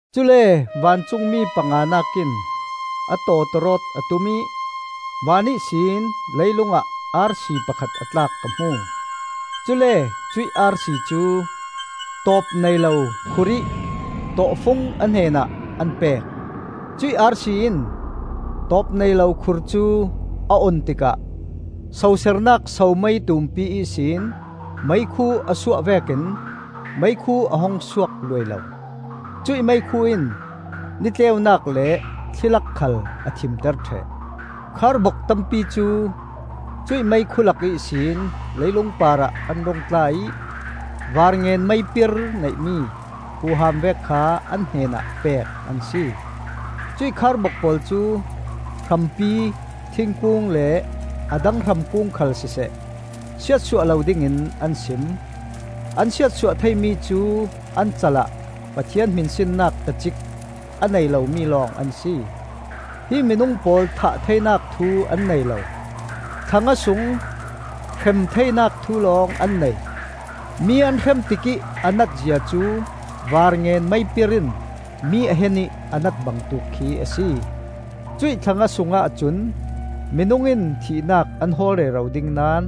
Cule vancungmi panganak in a tawtawrawt a tum ih van ihsin leilungah arsi pakhat a tlak ka hmu. Cule cuih arsi cu tawpneilo khurih tawhfung a hnenah an pek. Cuih arsi in tawpneilo khur cu a on tikah sosernak somei tumpi ihsin meikhu a suah vekin meikhu a hung suak luailo. Cuih meikhu in ni tleunak le thli lak khal a thimter ṭheh. Kharbok tampi cu cuih meikhu lak ihsin leilung parah an rung tla ih varngen meipir neihmi huham vek kha an hnenah pek an si. Cuih kharbok pawl cu hrampi, thingkung le a dang hramkung khal siseh, siatsuah lo dingin an sim. An siatsuah theimi cu an cal ah Pathian hminsinnak tacik a nei lomi lawng an si. Hi minung pawl thah theinak thu an nei lo; thla nga sung hrem theinak thu lawng an nei. Mi an hrem tikih a nat zia cu varngen meipir in mi a hen ih a nat bangtuk khi a si. Cuih thla nga sungah cun minung in thihnak an hawl rero ding naón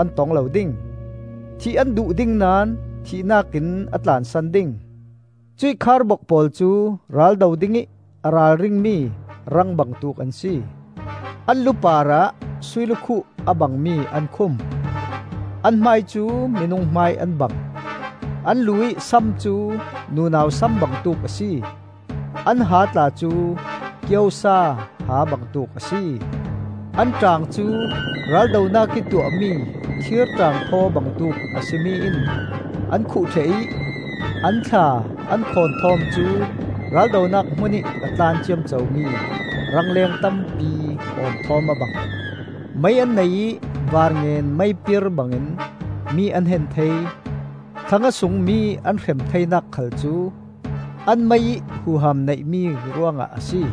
an tong lo ding; thih an duh ding naón thihnak in a tlansan ding. Cuih kharbok pawl cu raldo dingih a ralringmi rang bangtuk an si. An lu parah sui lukhuh a bangmi an khum; an hmai cu minung hmai an bang. An lu-ih sam cu nunau sam bangtuk a si; an ha tla cu kiosa ha bangtuk a si. An ṭaang cu raldonak ih tuahmi thir ṭaangphaw bangtuk a si mi in an khuh ṭheh ih an thla an khawn thawm cu raldonak hmunih a tlan ciamcomi rangleng tampi awn thawm a bang. Mei an nei ih varngen meipir bangin mi an hen thei; thla nga sung mi an hrem theinak khal cu an mei ih huham neihmi ruangah a si.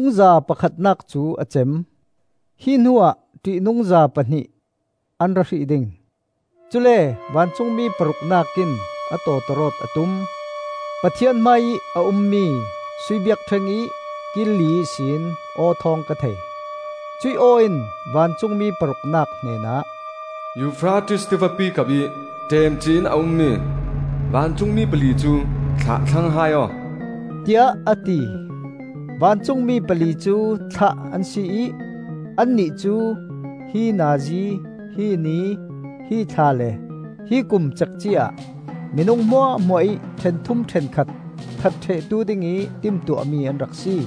Ṭihnungza pakhatnak cu a cem; hi hnuah ṭihnungza pahnih an ra hrih ding. Cule vancungmi paruknak in a tawtawrawt a tum. Pathian hmaiih a ummi sui biakṭheng ih kil li ihsin aw thawng ka thei. Cuih aw in vancungmi paruknak hnenah, “Eufrates Tivapi kapih ṭemcih in a ummi vancungmi pali cu thlah thlang hai aw,” tiah a ti. Vancungmi pali cu thlah an si ih annih cu hi nazi, hi ni, hi thla le hi kum cekci-ah minung hmuahhmuah ih ṭhenthum ṭhenkhat that ṭhehtu dingih timtuahmi an rak si.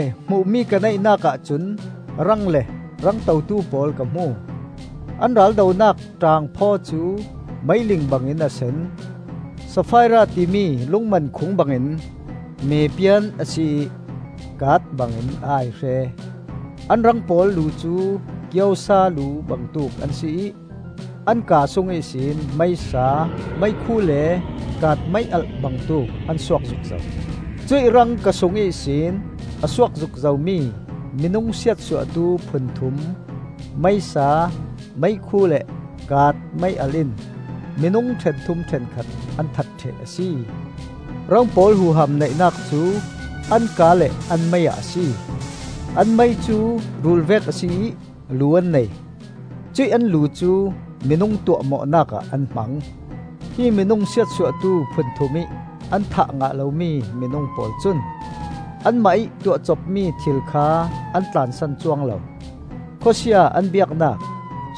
Cule hmuhmi ka neihnak ahcun rang le rang totu pawl ka hmu. An raldonak ṭaangphaw cu meiling bangin a sen, safaira timi lungmankhung bangin mepian a si ih kaat bangin a aihre. An rang pawl lu cu kiosa lu bangtuk an si ih an kaa sung ihsin meisa, meikhu le kaat mei-alh bangtuk an suak zukzo. Cuih rang ka sung ihsin a suak zukzo mi minung siatsuahtu phunthum: meisa, meikhu le kaat mei-alh in minung ṭhenthum ṭhenkhat an that ṭheh a si. Rang pawl huham neihnak cu an kaa le an mei ah a si. An mei cu rul vek a si ih lu an nei; cuih an lu cu minung tuahmawhnak ah an hmang. Hi minung siatsuahtu phunthum ih an thah ngah lomi minung pawl cun anmah ih tuahcopmi thil kha an tlansan cuang lo. Khawsia an biaknak,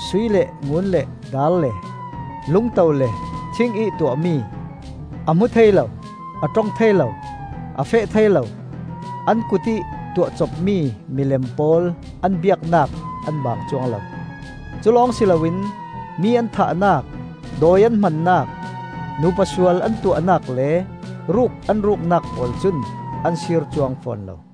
sui le ngun le daar le lungto le thing ih tuahmi, a hmu thei lo, a ṭong thei lo, a feh thei lo, an kutih tuahcopmi milem pawl an biaknak an baang cuang lo. Culawng si loin mi an thahnak, dawi an hmannak, nupa sual an tuahnak le ruk an ruknak pawl cun an sir cuang fawn lo.